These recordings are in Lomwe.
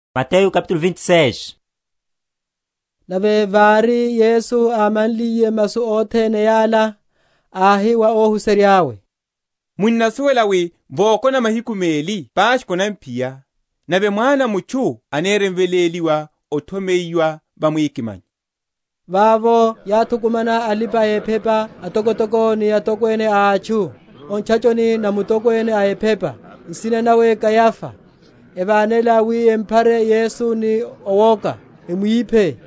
Makhuche a aYuda. Nave vári Yesu ámanliye masu othene yala, áhi wa óhuserya’we, Munnasuwela wi vokona mahiku meli Paskha anaphiya, nave Mwana a mutchu anirimveléliwa othomeyiwa va mwikimanyo. Vavo yáthukumana alipa‐ephepa atokotoko, ni atokwene a atchu, o ntchachoni na mutokwene a ephepa, nsina nawe Kayafa; evánela wi emphare Yesu ni owoka, emwiphe.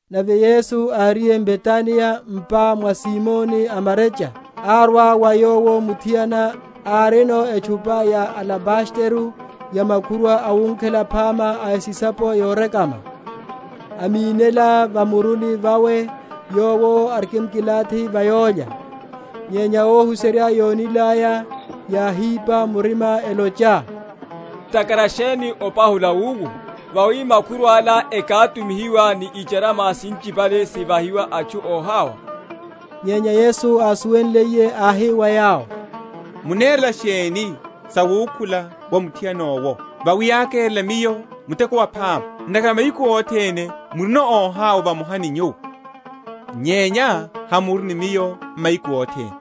Nave Yesu áriye m’Betaniya, m’pa mwa Simoni a marecha, árwa wa Yowo muthiana, arino etchupa ya alabastero ya makhurwa awunkhela phama a esisapo yorekama, amínela va muruni vawe, Yowo arikimkilathi va yólya. Nyenya óhuserya yónilaya, yáhipa murima, elocha, Ntakhara sheni opahula wiwo? Vawi makhurwa’la ekátumihiwa ni icharama sinchipale, sivahiwa atchu óhawa. Nyenya Yesu ásuwenliye áhi wa yawo, Munerela sheni sawukhula wa muthiana owo? vawi ákérela Miyo muteko waphama. Ntakhara mahiku othene murino óhawa vamoha ni nyuwo; nyenya hamuri ni Miyo mahiku othene.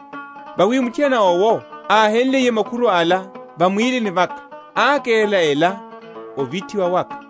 Vawi muthiana owo, áhenliye makhurwa’la va mwílini vaka, ákerela ela ovithiwa waka.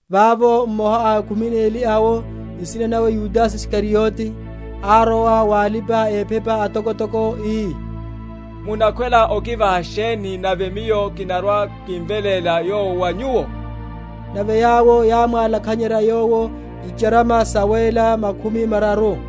Vavo mmoha a khumi neli awo, nsina nawe Yudase Isikariote, árowa wa alipa‐ephepa atokotoko, ii, Munakhwela okivaha sheni, nave miyo kinarwa‐kimveléla Yowo wa nyuwo? Nave yawo yámwálakhanyerya yowo icharama sawéla makhumi mararu.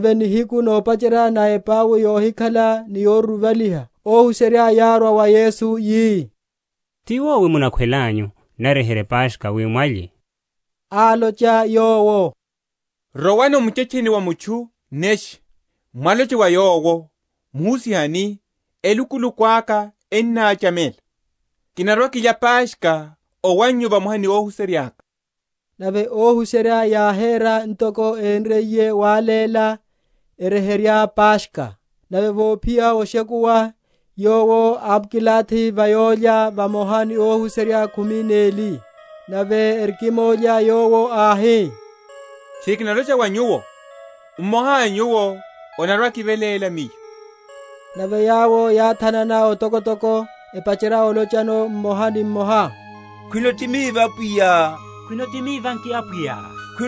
Nave nihiku nopacherya na epau yohikhala ni yoruruvaliha, óhuserya yárwa wa Yesu, yi, Ti wowi munakhwelanyu naryeherye Paskha wi mwalye? Álocha Yowo, Rowani o muchetcheni wa mutchu neshe, mwaloche wa yowo, Muhusiha ani, Elukuluku aka ennáchamela; kinarwa‐kilya Paskha owannyu vamoha ni óhuserya’ka. Nave óhuserya yáhéra ntoko énriye wáléla, eryeherya Paskha. Nave vophiya oshekuwa, Yowo ámkilathi va yólya vamoha ni óhuserya khumi neli; Nave erikimólya, Yowo áhi, Tchiri kinalocha wa nyuwo, mmoha a nyuwo anarwa‐akiveléla Miyo. Nave yawo yáthanana otokotoko, epacherya olochano mmoha mmoha, Khwino ti miva nki, Apwiya?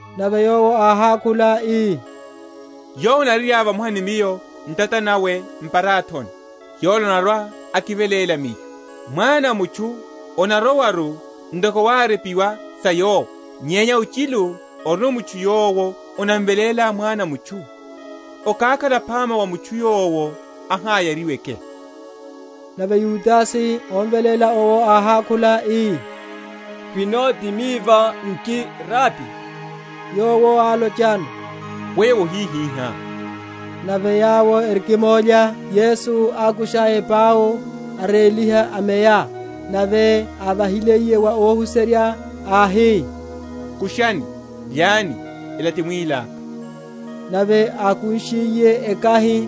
Nave Yowo áhákhula ii, Yowo anaryerya vamoha ni Miyo ntata nawe m’parathoni, yola anarwa‐akiveléla Miyo. Mwana a mutchu anarowaru, ntoko wárepiwa sa Yowo; nyenya ochilu orino mutchu yowo anamveléle Mwana a mutchu! okákhala phama wa mutchu yowo aháyariweke. Nave Yudase, omveléla owo áhákhula ii, Khwino ti miva nki, Rabi? Yowo alochano, Weyo wohihihá. Nave yawo erikimólya, Yesu ákusha epau, aréliha, ameya; nave ávahiliye wa óhuserya, áhi, Kushani, lyani; ela ti mwíli aka. Nave ákunshiye ekahi,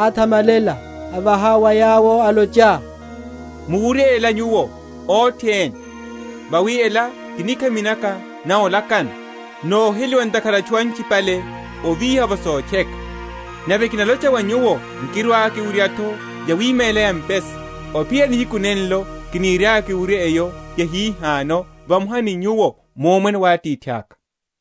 áthamalela, avaha wa yawo, alocha, Muwurye ela nyuwo othene, vawi ela ti nikhami naka na olakana, noheliwa ntakhara a atchu anchipale ovíha’vo sotcheka. Nave kinalocha wa nyuwo, nkirwa‐kiwurya’tho yawima ela ya mpesa, ophiyerya nihiku nenlo kiniriaka kirwe‐kiwurye eyo yahihano, vamoha ni nyuwo, mu Omwene wa Atithaka.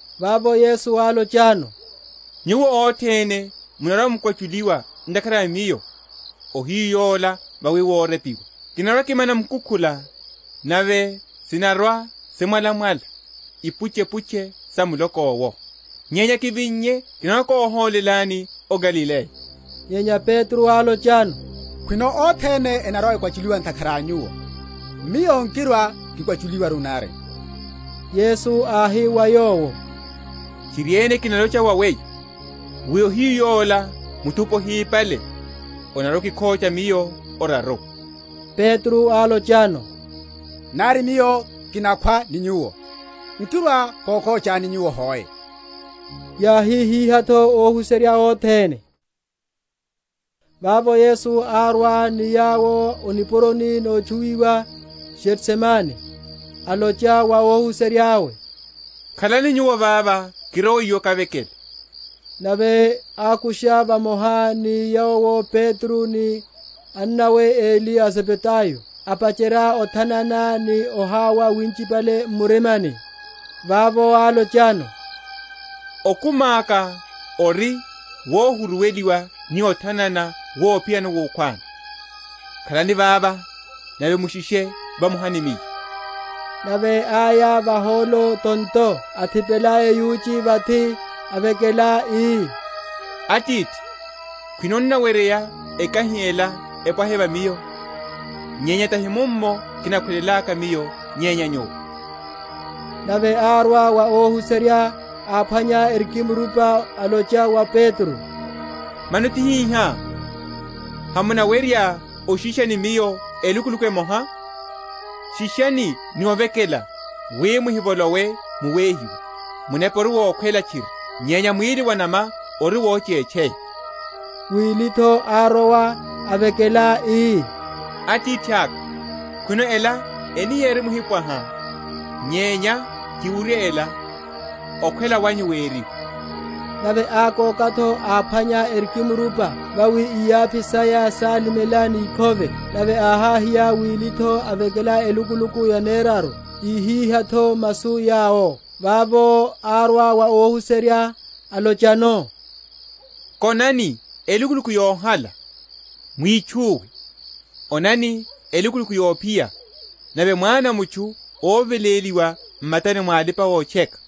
Vavo Yesu álochano, Nyuwo othene munarwa‐mukwachuliwa ntakhara a Miyo, ohiyu yola: vawi worepiwa, Kinarwa‐kimana mukukhula, Nave sinarwa‐simwalamwala Ipuchepuche sa muloko’wo. Nyenya kivinnye kinarwa‐kohólelani o Galileya. Nyenya Petro álochano, Khwino othene enarwa‐ekwachuliwa ntakhara a Nyuwo, miyo nkirwa‐kikwachuliwaru nari. Yesu áhi wa yowo, Tchiriene kinalocha wa weyo, wi ohiyu yola, muthupi ohipale, onarwa‐okikhocha Miyo oraru. Petro álochano, Nari miyo kinakhwa ni Nyuwo, nkirwa‐kokhochani Nyuwo hoe. Yáhihihá’tho óhuserya othene. Getsemane. Vavo Yesu árwa ni yawo o nipuroni notchuwiwa Getsemane, alocha wa óhuserya’we, Khalani nyuwo vava, kirowe iwo kavekele. Nave ákusha vamoha ni Yowo Petro ni anamwane eli a Zebedayo, apacherya othanana ni ohawa winchipale m’murimani. Vavo álochano, Okumi aka ori wohuruweliwa ni othanana wophiyano wukhwani: khalani vava nave mushishe vamoha ni Miyo. Nave áya vahólo tonto, athipela eyuchi vathi, avekela, ii, Atithi, khwino onaweryeya, ekahi ela epwahe va Miyo; nyenya tahi mummo kinakhwelelaka Miyo, nyenya Nyuwo. Nave árwa wa óhuserya, áphwanya erikimrupa, alocha wa Petro, Mano tihihá? hamunawerya oshisha ni Miyo elukuluku emoha? Shishani ni ovekela, wi muhivolowe mu wehiwa: munepa ori wokhwela tchiri, nyenya mwíli wa enama ori wochetcheya. Wili’tho árowa, avekela, ii, Atithaka, khwino ela enirimhipwaha, nyenya kiwurye ela, okhwela wanyu weriwe. Nave ákoka’tho, áphwanya erikimrupa, vawi iyaphi saya sálimela ni ikhove. Nave áháhiya wili’tho, avekela elukuluku yaneraru, íhihá’tho masu yawo. Vavo árwa wa óhuserya, alochano, Konani elukuluku yohala, mwitchuwe: onani, elukuluku yophiya, nave Mwana a mutchu oveléliwa m’matani mwa alipa‐otcheka.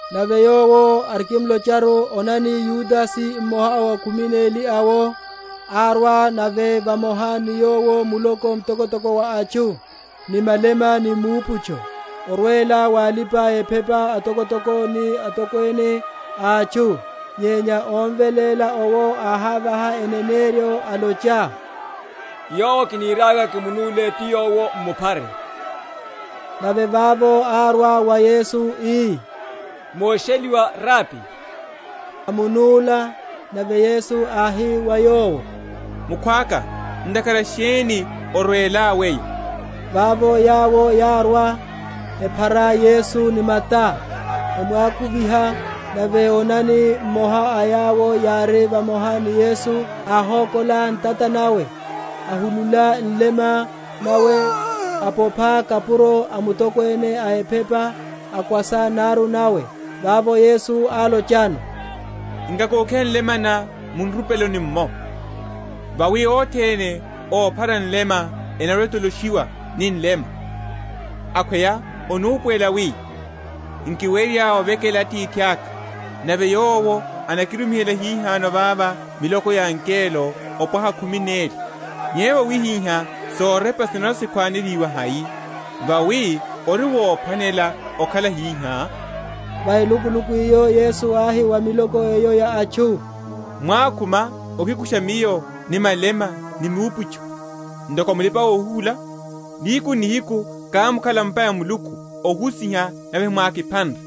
Nave Yowo arikimlocharu, onani, Yudase, mmoha a khumi neli awo, árwa, nave vamoha ni yowo muloko mtokotoko wa atchu, ni malema ni miuputcho, orwela wa alipa‐ephepa atokotoko ni atokwene a atchu. Nyenya ómveléla owo áhávaha eneneryo, alocha, Yowo kiniriaka kimunúle ti Yowo, mumphare. Nave vavo árwa wa Yesu, ii, Mosheliwa, Rabi; amunúla. Nave Yesu áhi wa yowo, Mukhwaka, ntakhara sheni orwelá weyo? Vavo yawo yárwa, ephara Yesu ni mata, emwakuviha. Nave onani, mmoha a yawo yári vamoha ni Yesu, áhókola ntata nawe, ahulula nlema nawe, apopha kapuro a mutokwene a ephepa, akwasa naru nawe. Vavo Yesu álochano, Nkakokiha nlema ná mu nrupeloni’mmo, vawi othene óphara nlema enarwa‐etoloshiwa ni nlema. Akhweya onupuwela wi nkiwerya ovekela Atithaka, nave Yowo anakirumihela hihano vava miloko ya angelo opwaha khumi neli? Nyenya vawihihá sorepa sinarwa‐sikhwanelihiwa hai, vawi, ori wophwanela okhala hihá? Va elukuluku eyo Yesu áhi wa miloko eyo ya atchu, Mwákhuma okikusha Miyo ni malema ni miuputcho, ntoko mulipa‐ohuhula? Nihiku n’nihiku kámkhala va’mpa ya Muluku ohusiha; nave hemwákiphanre?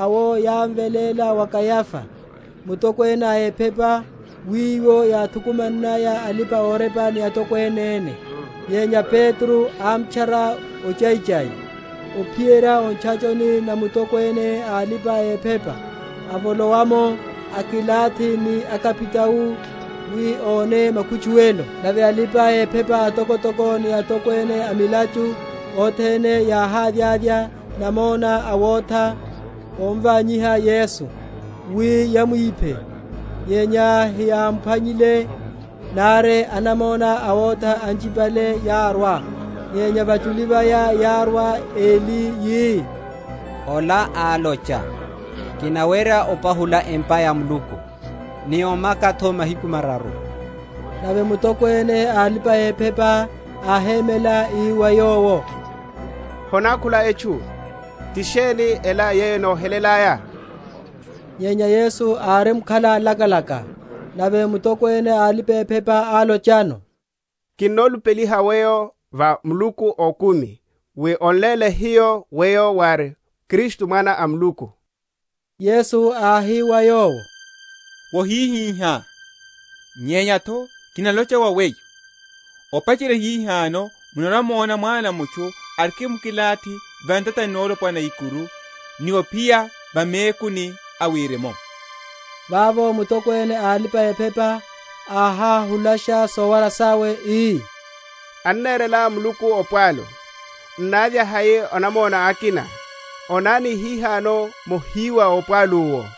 Nave óphara Yesu awo yámveléla wa Kayaía, mutokwene a ephepa, wiwo yáthukumannaya alipa‐orepa ni atokwene ene. Nyenya Petro ámtchara ochaichai, ophiyerya o ntchachoni na mutokwene a alipa‐ephepa, avolowa’mo, akilathi ni akapitao, wi óne makutchuwelo. Nave alipa‐ephepa atokotoko ni atokwene a milachu othene yáhávyavya namona awotha óvanyiha Yesu, wi yamwiphe; nyenya heyámphwanyile, nari anamona awotha anchipale yárwa. Nyenya vachuli vaya yárwa eli, yi, Ola álocha, Kinawerya opahula empa ya Muluku, ni omaka’tho m’mahiku mararu. Nave mutokwene a alipa‐ephepa áhémela, ii wa Yowo, Honákhula etchu? ti sheni ela yeyo enohelelaya? Nyenya Yesu árimkhala lakalaka. Nave mutokwene a alipa‐ephepa álochano, Kinolupeliha Weyo va Muluku a okumi, wi on’léle hiyo Weyo wári Kristu, Mwana a Muluku. Yesu áhi wa yowo, Wohihihá, nyenya’tho kinalocha wa weyo, Opacherya hihano munarwa‐mona Mwana a mutchu arikimkilathi va ntatani nolopwana na ikuru, ni ophiya va mekuni a wirimu. Vavo mutokwene a alipa‐ephepa áháhulasha sowara sawe, ii, Anerela Muluku opwalu: n’návya hai anamona akina? Onani hihano mohiwa opwalu’wo.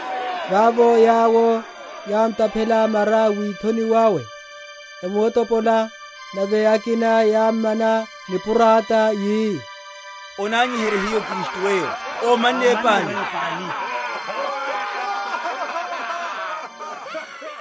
Vavo yawo yámtaphela mara withoni wawe, emuotopola: nave akina yámmana nipurata, yi, Onanyiherye hiyo Kristu Weyo: Ómanne Weyo pani? Okhocha wa Petro.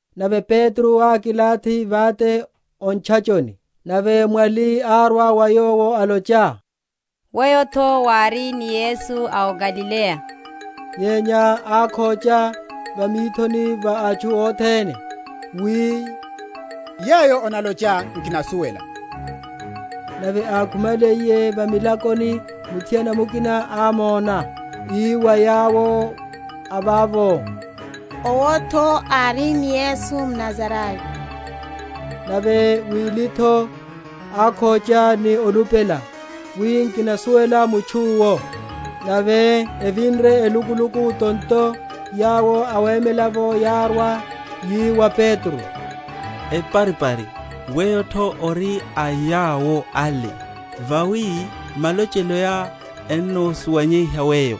Nave Petro ákilathi vate o ntchachoni: nave mwali árwa wa yowo, alocha, Weyo’tho wári ni Yesu a Galileya. Nyenya ákhocha va mithoni va atchu othene, wi, Yeyo onalochá nkinasuwela. Nave ákhumaliye va milakoni, muthiana mukina ámona, ii wa yawo a vavo, Owo’tho ári ni Yesu Mnazarayo. Nave wili’tho ákhocha ni olupela, wi, Nkinasuwela mutchu’wo. Nave evinre elukuluku tonto, yawo awemela’vo yárwa, yi wa Petro, Eparipari, weyo’tho ori a yawo ale; vawi malocheloá ennosuwanyeiha weyo.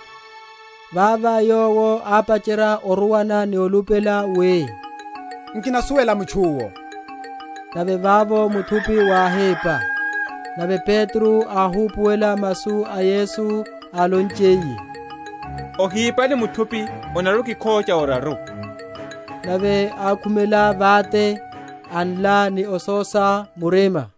Vava yowo ápacherya oruwana ni olupela, wi, Nkinasuwela mutchu’wo. Nave vavo muthupi wáhípa. Nave Petro áhupuwela masu a Yesu álonchiye, Ohipale muthupi onarwa‐okikhocha oraru. Nave ákhumela vate, anla ni ososa murima.